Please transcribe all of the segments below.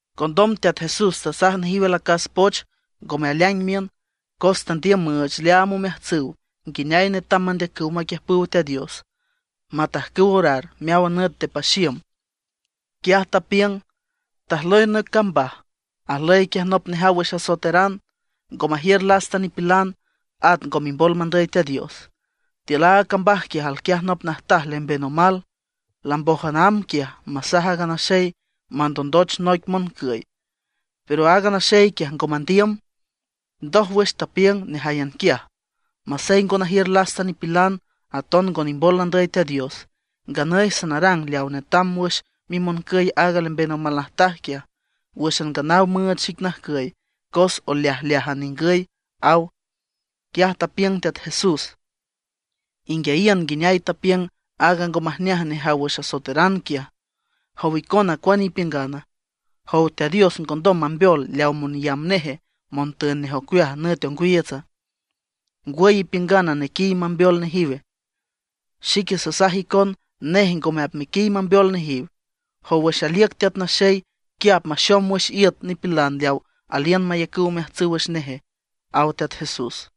Condom Teat Jesús tasaj nejiw alacas poch ngome aleaing miün, cos tandiüm müüch leaam omeajtsüw nguineay netam mandeacüw maquiüjpüw Teat Dios, matajcüw orar meáwan nüt nde paxiüm. Quiaj tapiüng: ―Tajlüy noic cambaj, ajlüy quiaj nop nejaw wüx asoeteran, ngo majiür lasta nipilan, at ngo mimbol mandüy Teat Dios. Tiül aaga cambaj quiaj alquiaj nop najtaj lemben omal, lambójan amb quiaj masaj aaga naxey mandondoch noic moncüy. Pero aaga naxey quiaj ngo mandiüm. Ndójwüx tapiüng nejáyan quiaj: “Masey ngo najiür lasta nipilan, aton ngo nimbol nandüy Teat Dios; nganüy sanarang leaw netam wüx mimoncüy aaga lemben omal najtaj quiaj, wǘxan nganaw müüch xic najcüy cos oleajleájan ningüy”, ―aw. Quiaj tapiüng Teat Jesús: ―Inguiayiün nguineay tapiüng aaga ngo majneaj nejaw wüx asoeteran quiaj. ¿Jow icona cuane ipiüngana? ¿Jow Teat Dios ngondom mambeol leaw monyamb neje, montün nej ocueaj nüt ongwiiütsa? ¿Ngwüy ipiüngana nequiy mambeol nejiwe? Xique sasaj icon, nej ngome apmequiy mambeol nejiw. Jow wüx aliüc Teat Naxey, ¿quia apmaxom wüx iüt nipilan leaw aliün mayacüw omeajtsüw wüx neje? ―aw Teat Jesús.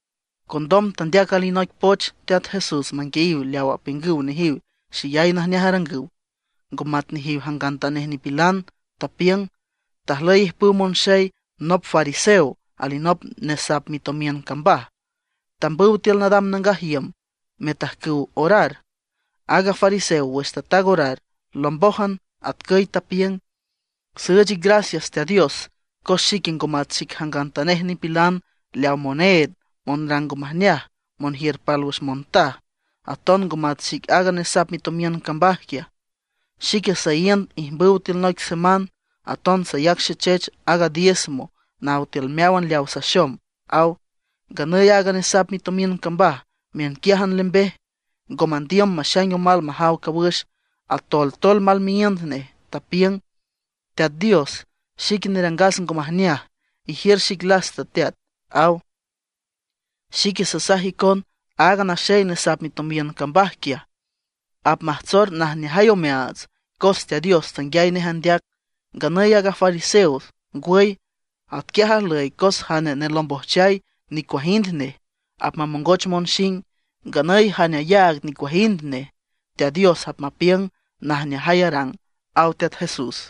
Condom tandeac alinoic poch Teat Jesús manguiayiw leaw apiüngüw nejiw xeyay najneaj arangüw, ngo matnejiw jangantanej nipilan. Tapiüng: ―Tajlüy ijpüw monxey, nop fariseo, alinop nesap mitomiün cambaj. Tambüw tiül nadam nangaj iüm metajcüw orar. Aaga fariseo wüx tataag orar, lombójan, atcüy tapiüng: “Süüch ic gracias Teat Dios, cos xique ngo mat xic jangantanej nipilan leaw moneed, monrang ngo majneaj, monjiür pálwüx montaj; aton ngo mat xic aaga nesap mitomiün cambaj quiaj. Xique saíünd ijmbüw tiül noic seman; aton sayac xechech aaga diezmo naw tiül meáwan leawa saxom”, aw. Nganüy aaga nesap mitomiün cambaj miünquiájan lembej, ngo mandiüm maxaing omal majaw cawüx, atoltol mal miíünd nej, tapiüng: “¡Teat Dios, xique nerangas ngo majneaj, ijiür xic lasta Teat!” aw. Xique sasaj icon aaga naxey nesap mitomiün cambaj quiaj, apmajtsor najneajay omeaats cos Teat Dios tanguiay nej andeac. Nganüy aaga fariseo ngwüy. Atquiaj ajlüy cos jane nelombojchay, nicuajind nej, apmamongoch monxing. Nganüy jane ayaag nicuajind nej, Teat Dios apmapiüng, najneajay arang ―aw Teat Jesús.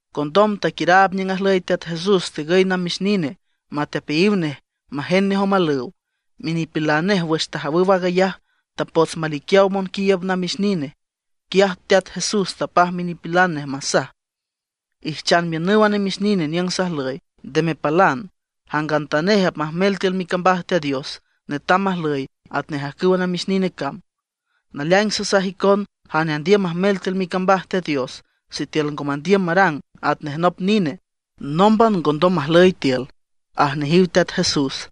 Condom taquiüraab niüng ajlüy Teat Jesús tegüy namix nine matepeayiw nej majend nej omalüw. Minipilan nej wüx tajawüw aag ayaj, tapots maliquiaw monquiiüb namix nine. Quiaj Teat Jesús tapaj minipilan nej masaj: ―Ijchan miünüw a namix nine niüng sajlüy, nde mepalan. Jangantanej apmajmel tiül micambaj Teat Dios netam majlüy atnej ajcüwa namix nine cam. Naleaing sasaj icon jane andiüm majmel tiül micambaj Teat Dios, sitiül ngo mandiüm marang atnej nop nine, nómban ngondom majlüy tiül ―aj nejiw Teat Jesús.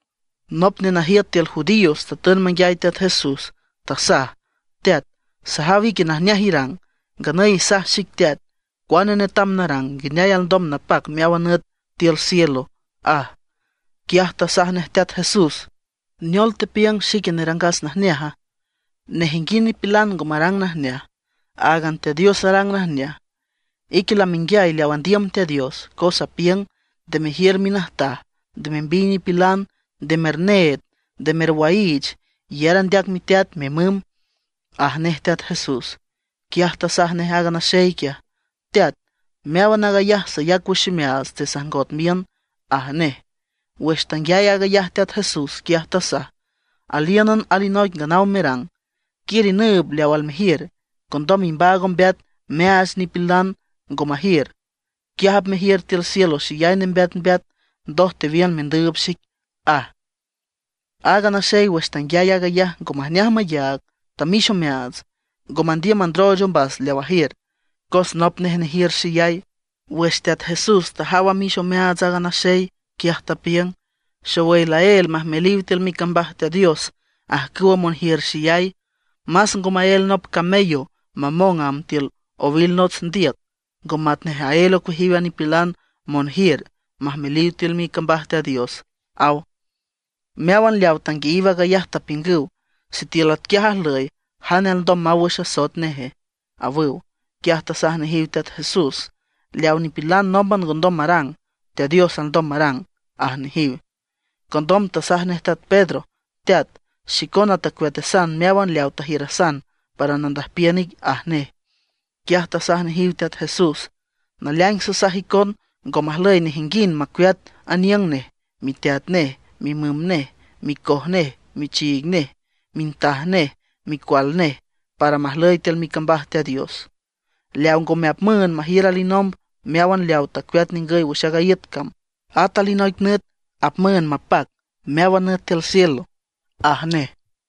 Nop nenajiüt tiül judíos tatün manguiay Teat Jesús, tasaj: ―Teat, sajaw ique najneaj irang. Nganüy isaj xic Teat, ¿cuane netam narang, nguineay alndom napac meáwan nüt tiül cielo? ―aj. Quiaj tasaj nej Teat Jesús: ―¿Neol tepiüng xique nerangas najneaja? Nejinguind nipilan ngo marang najneaj; áagan Teat Dios arang najneaj. Ique lamenguiay leaw andiüm Teat Dios, cos apiüng: “Nde mejiür minajtaj; nde membiy nipilan; nde merneed; nde merwaiich; iyar andeac miteat, mimüm” ―aj nej Teat Jesús. Quiaj tasaj nej aaga naxey quiaj: ―Teat, meáwan aag ayaj sayac wüx ximeaats nde sajngot miün ―aj nej. Wüx tanguiay aag ayaj Teat Jesús, quiaj tasaj: ―Alíünan alinoic nganaw merang. Quiür inüüb leaw almejiür, condom imbaag ombeat meaach leawa nipilan ngo majiür, quiaj apmejiür tiül cielo xeyay nembeatmbeat, ndoj tewiün mendüüb xic ―aj. Aaga naxey wüx tanguiay aag ayaj ngo majneaj mayaag, tamix omeaats, ngo mandiüm mandrooch ombas leaw ajiür, cos nop nej nejiür xeyay. Wüx Teat Jesús tajaw amix omeaats aaga naxey, quiaj tapiüng: ―¡Xowüy laél majmeliw tiül micambaj Teat Dios ajcüwa monjiür xeyay! Más ngo maél nop camello mamong amb tiül owil nots ndiüc, ngo matnej aél ocueajiw a nipilan monjiür majmeliw tiül micambaj Teat Dios ―aw. Meáwan leawa tanguiayiw aag ayaj tapiüngüw: ―Sitiül atquiaj ajlüy, ¿jane alndom maw wüx asoet neje? ―awüw. Quiaj tasaj nejiw Teat Jesús: ―Leaw nipilan nómban ngondom marang, Teat Dios alndom marang ―aj nejiw. Condom tasaj nej teat Pedro: ―Teat, xicona tacueatasan meáwan leaw tajiürasan para nandüjpiün ic ―aj nej. Quiaj tasaj nejiw Teat Jesús: ―Naleaing sasaj icon, ngo majlüy nejinguind macueat aniüng nej, miteat nej, mimüm nej, micoj nej, michiig nej, mintaj nej, micual nej, para majlüy tiül micambaj Teat Dios, leaw ngome apmüünd majiür alinomb meáwan leawa tacueat ningüy wüx aaga iüt cam, at alinoic nüt apmüünd mapac meáwan nüt tiül cielo ―aj nej.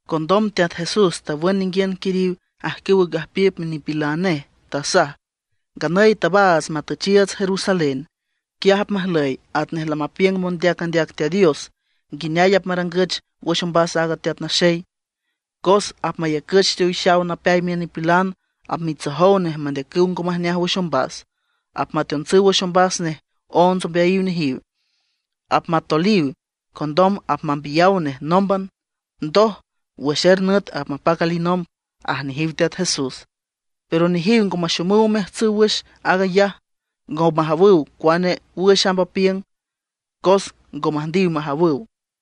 Condom Teat Jesús tawün ninguiün quiriw ajcüwa gajpiüp minipilan nej, tasaj: ―Nganüy tabaats matüchiiüts Jerusalén. Quiaj apmajlüy atnej lamapiüngüw mondeac andeac Teat Dios nguineay apmarangüch wüx ombas a Teat Naxey. Cos apmayacüch teowixaw napeay miün nipilan; apmitsojow nej mandeacüw ngo majneaj wüx ombas; apmateontsüw wüx ombas nej onts ombeayiw nejiw. Apmatoliw, condom apmambiyaw nej nómban. Ndoj, wüx er nüt apmapac alinomb ―aj nejiw Teat Jesús. Pero nejiw ngo maxomüw omeajtsüw wüx aag ayaj, ngo majawüw cuane wüx amb apiüng; cos ngo müjndiw majawüw.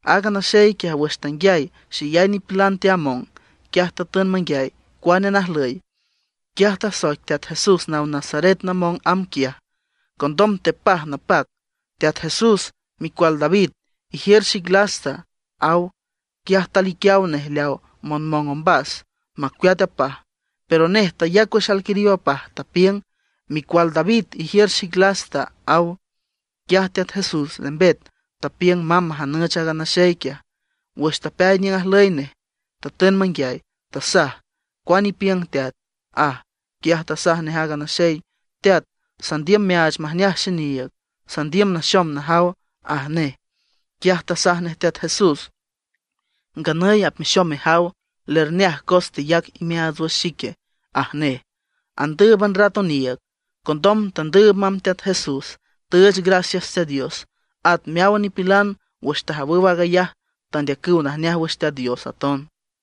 Aaga naxey quiaj wüx tanguiay xeyay nipilan teamong, quiaj tatün manguiay cuane najlüy. Quiaj tasoic Teat Jesús naw Nazaret namong amb quiaj. Condom tepaj napac: ―¡Teat Jesús, micual David, ijiür xic lasta! ―aw. Quiaj taliquiaw nej leaw monmong ombas, macueat apaj. Pero nej tayac wüx alquiriw apaj, tapiüng: ―¡Micual David, ijiür xic lasta! ―aw. Quiaj Teat Jesús lembet, tapiüng mamb majanüch aaga naxey quiaj. Wüx tapeay niüng ajlüy nej, tatün manguiay, tasaj: ―¿Cuane ipiüng, teat? ―aj. Quiaj tasaj nej aaga naxey: ―Teat, sandiüm meaach majneaj xiniiüg, sandiüm naxom najaw ―aj nej. Quiaj tasaj nej Teat Jesús: ―Nganüy apmexom mejaw; lerneaj cos teyac imeaats wüx xique ―aj nej. Andǘüban rat oniiüg, condom tandüüb mamb Teat Jesús, tüüch gracias Teat Dios. At meáwan nipilan wüx tajawüw aag ayaj tandeacüw najneaj wüx Teat Dios aton.